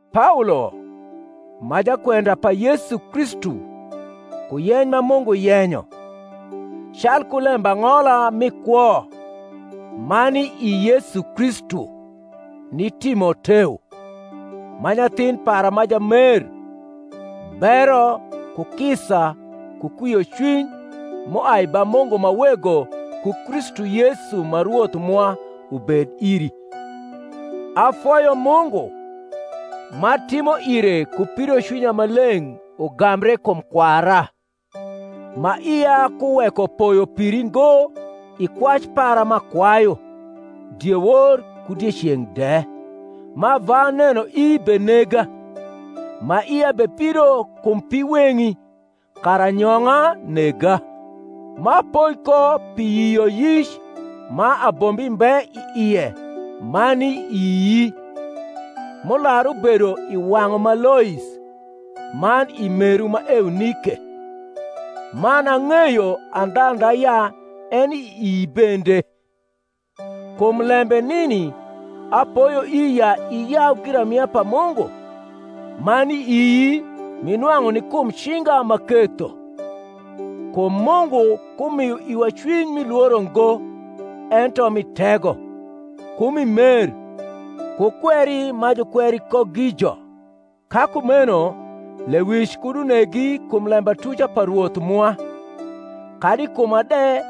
Paolo, ma jakwenda pa Yesu Kristu ku yeny ma Mungu yenyo, calku lembang’ola mi kwo ma ni i Yesu Kristu ni Timoteo, ma nyathin para ma jamer: bero, ku kisa, ku kwiocwiny, m’uai ba Mungu ma Wego ku Kristu Yesu ma Rwoth mwa ubed iri. Afoyo Mungu, m’atimo ire ku pidocwinya ma leng’ ugambre kum kwara, ma ia kuweko poyo piri ngo i kwac para m’akwayu, diewor ku dieceng’ de ma ava nenoi benega, ma ia bepido kum piweng’i, kara anyong’a nega; m’apoi ko pi yioyic ma abombi mbe i ie ma ni ii; m’ular ubedo i wang’u ma Lois, man i meru ma Eunike; man, ang’eyo andhandha ya eni ii bende. Kum lembe nini apoyoi ya iyau giramia pa Mungu, ma ni ii m’inwang’u ni kum cinga m’aketho. Kum Mungu ku mio iwa cwiny mi lworo ngo; ento mi tego, ku mi mer, ku kweri ma jukweri ko gijo. Ka kumeno lewic kud unegi kum lembatuca pa Rwoth mwa, kadi i kuma de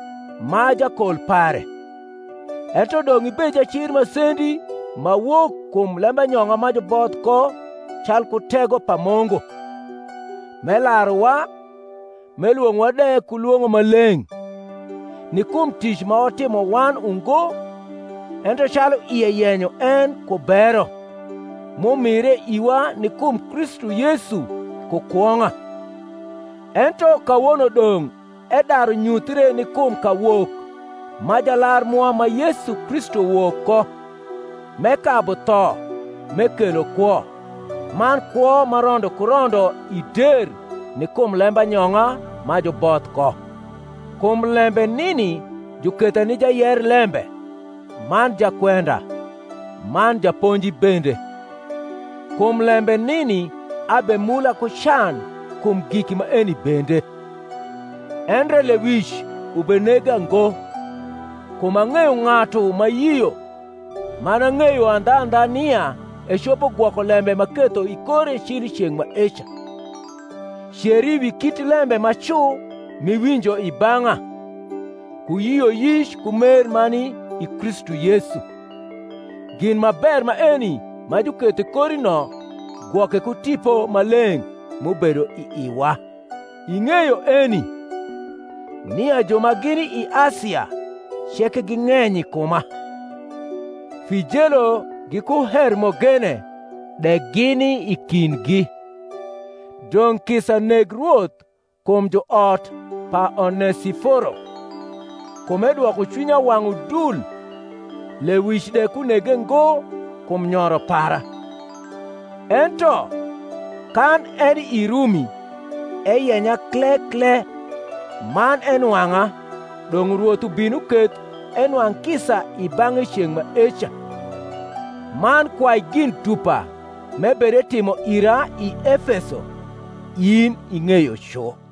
m’a jakol pare: ento dong’ ibed jacir masendi ma wok kum lembanyong’a ma juboth ko calku tego pa Mungu; m’elaruwa, m’elwong’owa de ku lwong’o ma leng’, ni kum tic ma watimo wan ungo, ento calu ie yenyo en ku bero, m’umire iwa ni kum Kristu Yesu ku kwong’a, ento kawono dong’ edaru nyuthre ni kum kawok ma Jalar mwa ma Yesu Kristu wok ko, m’ekabu tho, m’ekelo kwo, man kwo ma rondo ku rondo i der ni kum lembanyong’a ma juboth ko, kum lembe nini juketha ni jayer lembe, man jakwenda, man japonji bende. Kum lembe nini abemula ku can kum giki maeni bende: endre lewic ubenega ngo; kum ang’eyo ng’atu m’ayio, man ang’eyo andhandha nia ecopo gwoko lembe m’aketho i kore cil i ceng’ maeca. Ceri wi kit lembe ma cu m’iwinjo i bang’a, ku yioyic ku mer ma ni i Kristu Yesu. Gin ma ber maeni ma juketho i kori no gwoke ku Tipo Maleng’ m’ubedo i iwa. Ing’eyo eni, nia ju ma gini i Asia ceke ging’eny i kuma; Fijelo giku Hermogene de gini i kindgi. Dong’ kisa neg Rwoth kum juot pa Onesiforo: kum edwoko cwinya wang’ udul, lewic de kunege ngo kum nyoro para; ento, kan eni i Rumi, eyenya kle kle, man enwang’a (dong’ Rwoth ubin uketh enwang’ kisa i bang’e i ceng’ maeca); man kwai gin dupa m’ebederimo ira i Efeso, in ing’eyo cu.